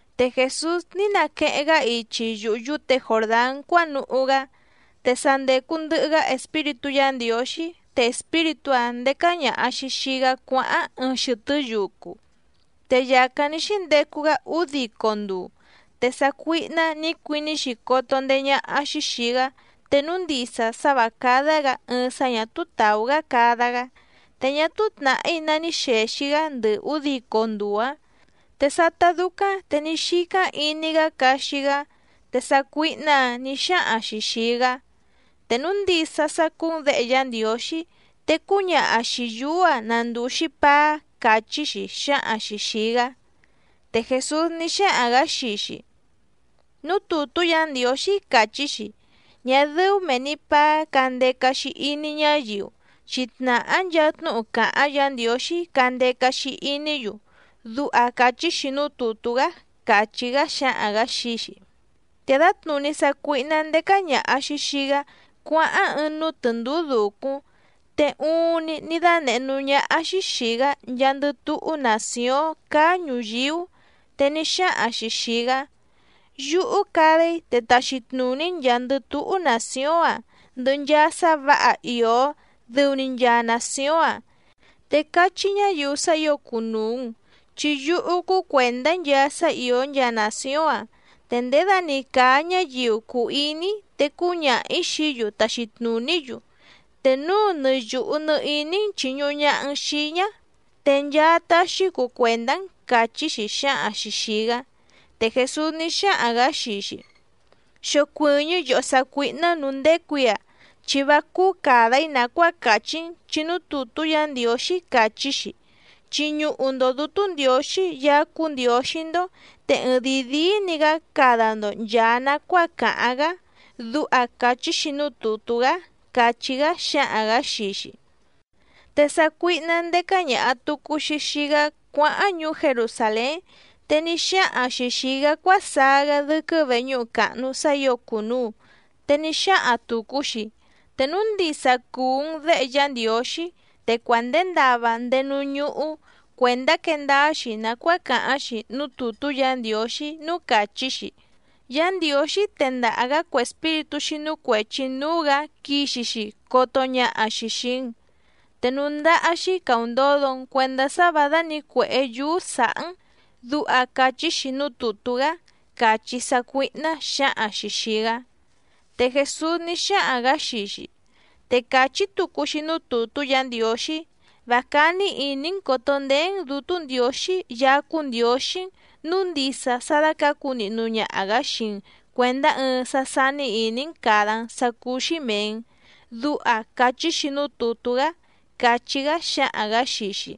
Te Jèsús ní naqueheⁿ‑gá ichi yuhu yúte Jòrdán cuánuhú‑gá. Te sa ndècu ndɨhɨ‑gá Espíritú Yǎ Ndiǒxí, te Espíritú‑áⁿ ndécá ñàha‑xi xii‑gá cuáháⁿ ɨɨⁿ xɨtɨ́ yucu. Te yàcáⁿ ní xíndecu‑gá údico nduu, te sácuíhná nǐ cuiní‑xi coto ndeé ñáhá‑xí xìi‑gá te núu ndisa sá vǎ cádá‑gǎ ɨɨⁿ sá ñà túú tàú‑gá cada‑gá. Te ñá túú tnàhí ná ní xèxi‑gá ndɨ ǔdico nduu‑áⁿ, te sátá dúcáⁿ te ní xícáⁿ iní‑gá caxi‑gá. Te sácuíhná‑ǎⁿ nǐ xáhaⁿ‑xi xìi‑gá: —Te núu ndisa sá cúú‑n Děhe Yá Ndiǒxí, te cúñaha xìi yúú‑a na ndùu‑xi paá —càchí‑xi xǎhaⁿ‑xi xìi‑gá. Te Jèsús ní xáhaⁿ‑gǎ xii‑xi: —Núú tùtú Yǎ Ndiǒxí càchí‑xi: “Ñá dɨ́ú mèe‑ni paá candeca‑xi iní ñáyiu, chi tnàhá nchaa tnúhu càháⁿ Yǎ Ndiǒxí candeca‑xi iní‑yu”, duha càchí‑xi núú tùtú‑gá —càchí‑gá xǎhaⁿ‑gǎ xii‑xi. Te dǎtnùní sácuíhná ndécá ñàha‑xi xii‑gá cuáháⁿ ɨɨⁿ núú tɨ̀ndúú dùcúⁿ, te uuⁿni ní dánèhé núú ñáhá‑xí xìi‑gá nchaandɨ túhú nàcióⁿ cáá ñùyíú. Te ní xáhaⁿ‑xi xìi‑gá: —Yúhú cada‑í, te taxi tnùní‑n nchàa‑ndɨ túhú nàcióⁿ‑a ndɨhɨ nchaa sá vǎha ìó dɨu‑ni nchaa nàcióⁿ‑a, te cachí ñáyiu sá ǐo cùnuu‑n, chi yúhú cúú cuèndá‑í nchaa sá ìó nchaa nàcióⁿ‑a, te ndědani càa ñáyiu cùu iní‑í te cúñaha‑ǐ xií‑yu taxi tnùní‑yu. Te núu nɨ yùhu nɨ iní‑n chìñuhu ñaha‑n xii‑í ñá, te nchaa taxi‑í cuu cuèndá‑n —càchí‑xi xǎhaⁿ‑xi xìi‑gá. Te Jèsús ní xáhaⁿ‑gǎ xii‑xi: —Xocuɨ̀ñɨ́ yòhó sácuíhná nǔú ndécù‑í‑a, chi vá cúú càda‑í nàcuáa càchí‑n chi núú tùtú Yǎ Ndiǒxí càchí‑xi: “Chiñuhu‑ndo Dǔtú Ndiǒxí Yaá cúú Ndiǒxí‑ndó, te ɨɨⁿdìi díí‑ni‑gǎ cada‑ndo nchàa nacuáa càháⁿ‑gá”, duha càchí‑xi núú tùtú‑gá —càchí‑gá xǎhaⁿ‑gǎ xii‑xi. Te sácuíhná ndécá ñàha tucu‑xi xii‑gá cuáháⁿ ñuú Jerusàlén, te ní xáhaⁿ‑xi xìi‑gá cuásaá‑gá dɨ́quɨ́ veñúhu càhnu sá ǐo cùnuu, te ní xáhaⁿ tùcu‑xi: —Te núu ndisa cùu‑n Déhe Yá Ndiǒxí te cuandèe ndava ndéé núú ñúhú cuèndá quee ndáá‑xi nàcuáa càháⁿ‑xi núú tùtú Yǎ Ndiǒxí núú càchí‑xi: Yá Ndiǒxí tendaha‑gǎ cue espíritú xínú cuèchi núú‑gǎ quixi‑xi coto ñaha‑xi xìi‑n. Te núú ndáhá‑xí càundodo‑n cuendá sá vǎ dánǐcuèhé yúú sǎhá‑n, duha càchí‑xi núú tùtú‑gá —càchí sácuíhná xǎhaⁿ‑xi xìi‑gá. Te Jèsús ní xáhaⁿ‑gǎ xii‑xi: —Te càchí tucu‑xi núú tùtú Yǎ Ndiǒxí: “Vá cání ìní‑n còto ndeé‑n Dǔtú Ndiǒxí Yaá cúú Ndiǒxí‑n nǔu ndisa sá dácǎcu nihnu ñaha‑gǎ xii‑n cuèndá ɨɨⁿ sá sání ìní‑n càda‑n sá cúú‑xí mèe‑n”, duha càchí‑xi núú tùtú‑gá —càchí‑gá xǎhaⁿ‑gǎ xii‑xi.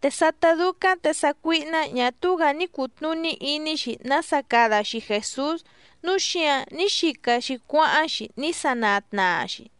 Te sátá dúcáⁿ te sácuíhná ñà túú‑gǎ ní cùtnuní iní‑xi nása cada‑xi Jèsús, núu xíǎⁿ ní xica‑xi cuáháⁿ‑xi ní sanaa tnaa‑xi.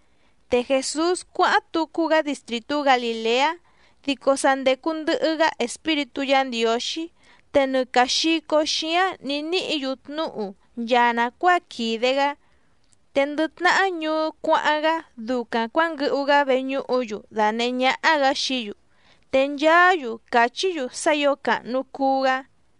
Te Jèsús cuáháⁿ tucu‑gá distrìtú Galìleá, dico sa ndècu ndɨhɨ‑gá Espíritú Yǎ Ndiǒxí, te nɨ càa xico xíáⁿ nǐ níhǐ‑yu tnúhu nchaa nàcuáa quìde‑gá. Te ndɨ tnahá ñuú cuáháⁿ‑gá ducaⁿ cuǎnguɨhu‑gá veñúhu‑yu dànehé ñáhá‑gǎ xií‑yu, te nchaá‑yu càchí‑yu sá ǐo càhnu cuu‑gá.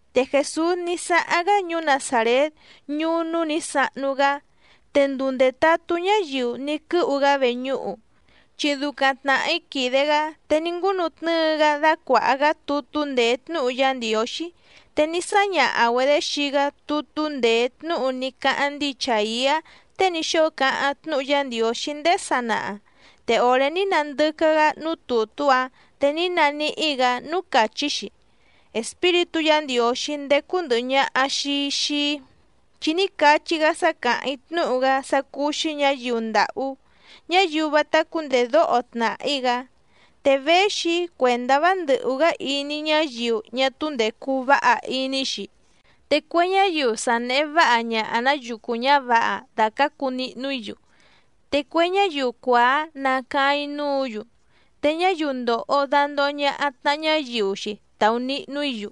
Te Jèsús ní sáháⁿ‑gá ñuú Nazàrét ñuú núú nǐ sahnu‑gá. Te nduu ndètatú ñáyiu ní quɨ́hu‑gá veñúhu, chi ducaⁿ tnàhí quìde‑gá, te ní ngúnutnɨ́ɨ‑gá dácuàha‑gá tutú ndèé tnúhu Yá Ndiǒxí. Te ní sáñaha‑güedě xii‑gá tutú ndèé tnúhu ní cáháⁿ ndíi Chàiá tée ní xóo cáháⁿ tnúhu Yá Ndiǒxí ndéé sanaha, te òré ní nandɨcá‑gá núú tùtú‑áⁿ te ní naníhí‑gǎ núú càchí‑xi: Espíritú Yǎ Ndiǒxí ndécú ndɨ̀hɨ ñaha‑xi xii‑í, chi ní cachí‑gá sá càháⁿ‑í tnúhu‑gá sá cúú‑xí ñǎyiu ndàhú, ñáyiu vátá cúndèdóho tnàhí‑gá. Te véxi‑í cuèndá vá ndɨ̀hú‑gá iní ñáyiu ñá túú ndècu váha iní‑xi, te cue ñáyiu sa nèhe váha ñaha‑nǎ yucu ñǎvǎha dàcácu nihnu‑í‑yu. Te cue ñáyiu cuàá nacaáⁿ‑í núǔ‑yu, te ñáyiu ndòho dandoho ñaha tnaha ñáyiu‑xi taunihnu‑í‑yu.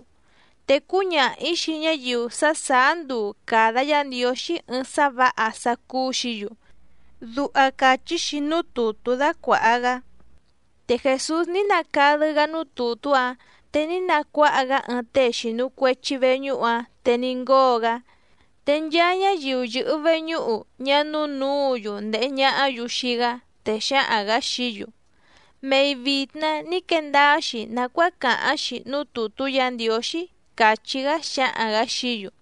Te cúñaha‑ǐ xii ñáyiu sá sàá nduu càda Yá Ndiǒxí ɨɨⁿ sá vǎha sá cúú‑xǐ‑yu. Duha càchí‑xi núú tùtú dácuàha‑gá. Te Jèsús ní nacadɨ́‑gá núú tùtú‑áⁿ, te ní nacuáha‑gá ɨɨⁿ tée xìnu cuechi veñúhu‑áⁿ, te ní ngóo‑gá. Te nchaa ñáyiu yɨ̀hɨ veñúhu ñá núú nǔǔ‑yu ndèhe ñahá‑yu xii‑gá. Te xǎhaⁿ‑gǎ xií‑yu: —Mei vìtna ní quee ndáá‑xi nàcuáa càháⁿ‑xi núú tùtú Yǎ Ndiǒxí —càchí‑gá xǎhaⁿ‑gǎ xií‑yu.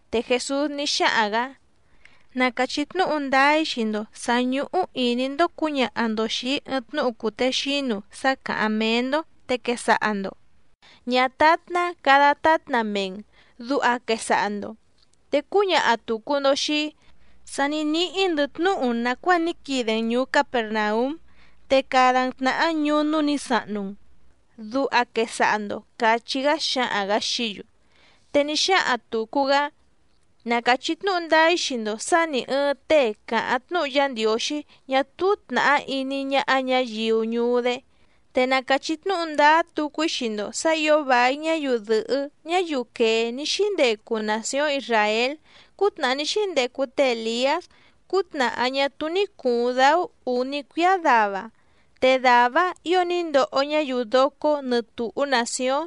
Te Jèsús ní xáhaⁿ‑gǎ: —Na càchí tnúhu ndáá‑í xii‑ndo sǎ ñúhú ìní‑ndó cǔñaha‑ndo xìi‑í ɨɨⁿ tnúhu cùtexínu sá càháⁿ méé‑ndó, te quesaha‑ndo: “Ñátátná cada tátna mee‑n”, duha quesaha‑ndo. Te cúñaha tùcu‑ndo xii‑í: “Sa ní níhí‑ndɨ̌ tnúhu nàcuáa ní quide‑n ñùú Capèrnaúm, te cada‑n tnàhá ñuú núú nǐ sahnu‑n”, duha quesaha‑ndo —càchí‑gá xǎhaⁿ‑gǎ xií‑yu. Te ní xáhaⁿ tùcu‑gá: —Na càchí tnúhu ndáá‑í xii‑ndo sǎ nì ɨɨⁿ tée càháⁿ tnúhu Yá Ndiǒxí ñá túú tnàhá iní ñáhá ñǎyiu ñuú‑dé. Te na càchí tnúhu ndáá tucu‑í xii‑ndo sǎ ǐo vài ñáyiu dɨ̀hɨ́ ñáyiu quèé ní xíndecu nàcióⁿ Isràél cútnàhá ní xíndecu té Èliás cútnàhá ñá túú ní cùuⁿ dáú ǔní cuíá dava, te dàvá‑áⁿ ǐo ní ndoho ñáyiu docó nɨtùhú nàcióⁿ.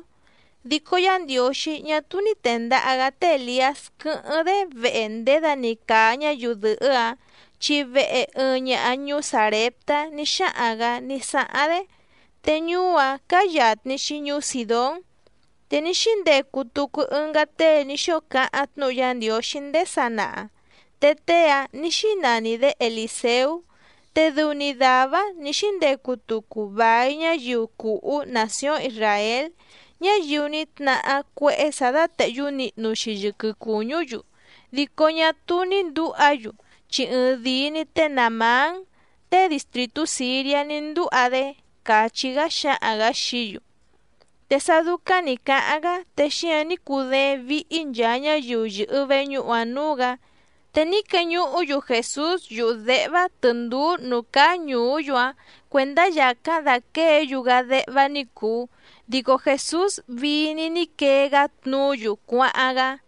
Dico Yá Ndiǒxí ñá túú ní tèndaha‑gá té Èliás quɨ́hɨ́ⁿ‑dé vehe ndědani càa ñáyiu dɨ̀hɨ́‑áⁿ, chi vehe ɨɨⁿ ñaha ñuú Sàreptá ní xáhaⁿ‑gǎ ní sáháⁿ‑dé, te ñuú‑áⁿ cáá yàtni‑xi ñuú Sìdón. Te ní xíndecu tucu ɨngá tée ní xóo cáháⁿ tnúhu Yá Ndiǒxí ndéé sanaha, te tée‑áⁿ nǐ xínani‑dě Elìseú, te dɨu‑ni dàvá‑áⁿ nǐ xíndecu tucu vài ñáyiu cùhú nàcióⁿ Isràél, ñáyiu ní tnahá cuéhé sǎ dátèhyú nihnu‑xi yɨquɨ cùñú‑yu dico ñá túú ní ndǔha‑yu, chi ɨɨⁿdìi‑ni té Nàamán tée distrìtú Sìriá ní ndúha‑dé —càchí‑gá xǎhaⁿ‑gǎ xií‑yu. Te sá dúcáⁿ nǐ cáháⁿ‑gá te xíǎⁿ ní cudééⁿ víhí nchàa ñáyiu yɨ̀hɨ veñúhu‑ǎⁿ núú‑gǎ. Te ní queñuhú‑yu Jèsús yuhu děhvá tɨ̀ndúú nǔú cáá ñùú‑yu‑áⁿ cuèndá yàcáⁿ dàquée‑yu‑gá déhvá ní cùu. Dico Jèsús vii‑ni ní quee‑gá tnuú‑yu cuáháⁿ‑gá.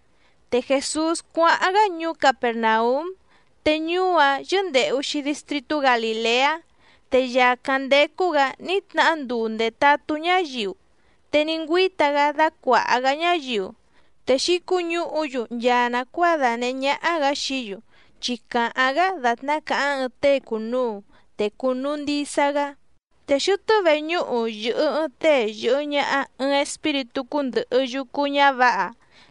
Te Jèsús cuáháⁿ‑gá ñuú Capèrnaúm, te ñuú‑áⁿ yɨ́ndèhu‑xi distritú Galìleá. Te yàcáⁿ ndécú‑gǎ ní tnahá nduu ndètatú ñáyiu, te ní ngüíta‑gá dácuàha‑gá ñáyiu. Te xǐcuñúhu‑yu nchaa nàcuáa dànehé ñáhá‑gǎ xií‑yu, chi càháⁿ‑gá dàtná càháⁿ ɨɨⁿ tée cùnuu, te cùnuu ndisa‑gá. Te xɨtɨ́ veñúhu yɨ̀hɨ ɨɨⁿ tée yɨ̀hɨ ñaha ɨɨⁿ espíritú cúndɨ̀hɨ yucu ñávǎha,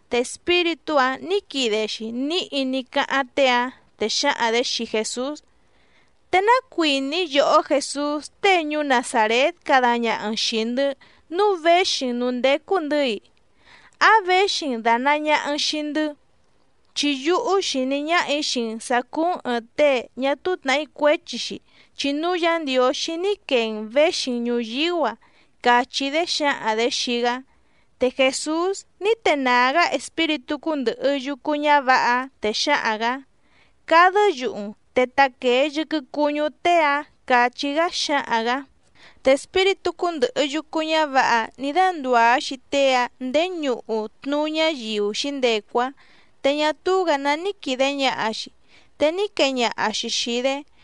te espíritú‑áⁿ nǐ quide‑xi níhi ní cáháⁿ tée‑áⁿ, te xǎhaⁿ‑dě xii Jèsús: —¿Te ná cuìní yòhó Jèsús tée ñuú Nazàrét cada ñaha‑n xìi‑ndɨ́ nǔu véxi‑n nǔú ndécú‑ndɨ̌‑i? ¿Áⁿ věxi‑n dànaa ñaha‑n xii‑ndɨ́? Chi yúhú xìní ñáhà‑í xii‑n sǎ cúú‑n ɨ̀ɨⁿ tée ñá túú tnàhí cuéchi‑xi chi núú Yǎ Ndiǒxí ní quee‑n věxi‑n ñùyíú‑a —càchí‑dé xǎhaⁿ‑dě xii‑gá. Te Jèsús ní tenàá‑gá espíritú cúndɨ̀hɨ yucu ñávǎha‑áⁿ, te xǎhaⁿ‑gǎ: —¡Cadɨ́ yuhu‑n, te taquèe yɨquɨ cuñú tée‑áⁿ! —càchí‑gá xǎhaⁿ‑gǎ. Te espíritú cúndɨ̀hɨ yucu ñávǎha‑áⁿ nǐ dándùá‑xi tée‑áⁿ ndèé ñuhu tnuú ñáyiu xǐndecu‑áⁿ, te ñá túú‑gǎ ná ní quìde ñaha‑xi, te ní quee ñaha‑xi xìi‑dé.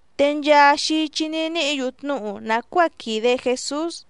Te nchaa xichi ní níhǐ‑yu tnúhu nàcuáa quìde Jesús.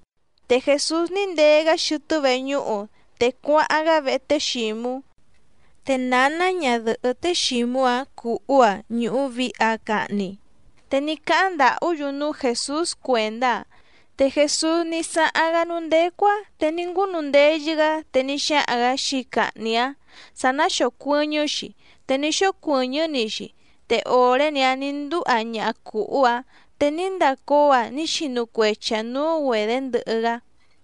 Te Jèsús ní ndee‑gá xɨtɨ́ veñúhu, te cuáháⁿ‑gá vehe té Xǐmú. Te nǎná ñadɨ̀hɨ́ té Xǐmú‑áⁿ cùhú‑aⁿ ñùhu vihi‑aⁿ cahni, te ní cáháⁿ ndàhú‑yu núú Jèsús cuèndá‑aⁿ. Te Jèsús ní sáháⁿ‑gá núú ndécú‑áⁿ, te ní ngúnundeyɨ‑gá te ní xáhaⁿ‑gǎ xii cahni‑áⁿ sǎ ná xòcuɨñɨ́‑xi, te ní xócuɨ̀ñɨ́‑ni‑xi, te òré‑ni‑áⁿ nǐ ndúha ñaha cùhú‑áⁿ te ní ndacóo‑aⁿ ní xinu cuechi‑aⁿ nǔú‑güedě ndɨhɨ‑gá.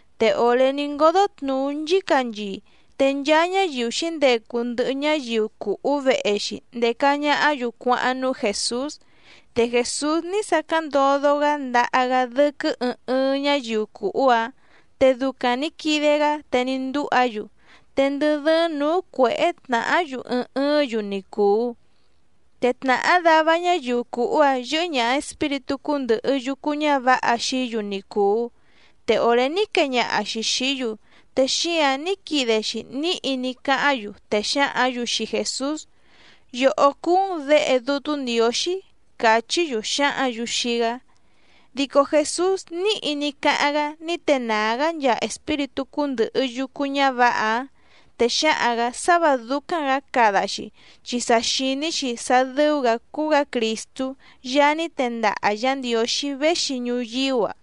Te òré ní ngódó tnùú nchícanchii, te nchaa ñáyiu xǐndecu ndɨhɨ ñáyiu cùhú vehe‑xi ndèca ñahá‑yu cuáháⁿ núú Jèsús. Te Jèsús ní sacáⁿ ndodo‑gá ndaha‑gá dɨ́quɨ́ ɨɨⁿ ɨɨⁿ ñáyiu cùhú‑áⁿ, te ducaⁿ nǐ quide‑gá te ní ndúha‑yu. Te ndɨ dɨ́ɨ́ⁿ nǔú cuěhé tnàhá‑yu ɨɨⁿ ɨɨ́ⁿ‑yu ni cùu. Te tnàhá dava ñáyiu cùhú‑áⁿ yɨ́hɨ́ ñàha espíritú cúndɨ̀hɨ yucu ñávǎha xií‑yu ni cùu, te òré ní quee ñaha‑xi xìí‑yu, te xíǎⁿ ní quide‑xi níhi ní cáháⁿ‑yu, te xǎhǎⁿ‑yu xii Jèsús: —Yòhó cúú‑n Děhe Dútú Ndiǒxí —càchí‑yu xǎhǎⁿ‑yu xii‑gá. Dico Jèsús níhi ní cáháⁿ‑gá ní tenàá‑gá nchaa espíritú cúndɨ̀hɨ yucu ñávǎha‑áⁿ, te xǎhaⁿ‑gǎ sá vǎ dúcáⁿ‑gǎ cada‑xi, chi sa xìní‑xi sá dɨ́ú‑gǎ cúú‑gǎ Crìstú Yaá ní tendaha Yǎ Ndiǒxí véxi ñuyíú‑a.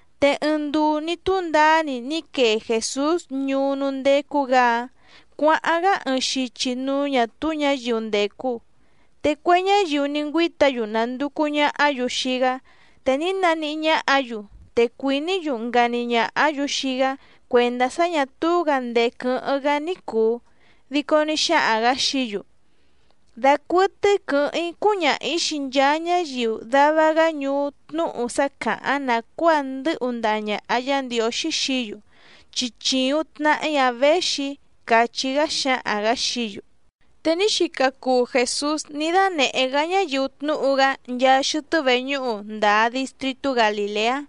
Te ɨɨⁿ nduu ní túndaá‑ni ní quee Jèsús ñuú núú ndécú‑gǎ‑áⁿ cuǎháⁿ‑gá ɨɨⁿ xichi núú ñǎ túú ñǎyiu ndècu. Te cue ñáyiu ní ngüíta‑yu nànducu ñahá‑yu xii‑gá te ní naníhí ñáhǎ‑yu, te cuìní‑yu ngani ñàhá‑yu xii‑gá cuèndá sá ñà túú‑gǎ ndèé quɨ́hɨ́ⁿ‑gá ní cùu. Dico ní xáhaⁿ‑gǎ xií‑yu: —Dacuɨtɨ́í quɨ̌hɨ́ⁿ‑í cúñaha‑ǐ xii nchaa ñáyiu dava‑gá ñuú tnúhu sá càháⁿ nàcuáa ndɨ́hu ndaha ñàha Yá Ndiǒxí xií‑yu, chi chìuⁿ tnahí‑ǎⁿ věxi‑í —càchí‑gá xǎhaⁿ‑gǎ xií‑yu. Te ní xica cuu Jèsús ní dánèhé‑gá ñáyiu tnúhu‑gá nchaa xɨtɨ́ veñúhu ndǎa distrìtú Galìleá.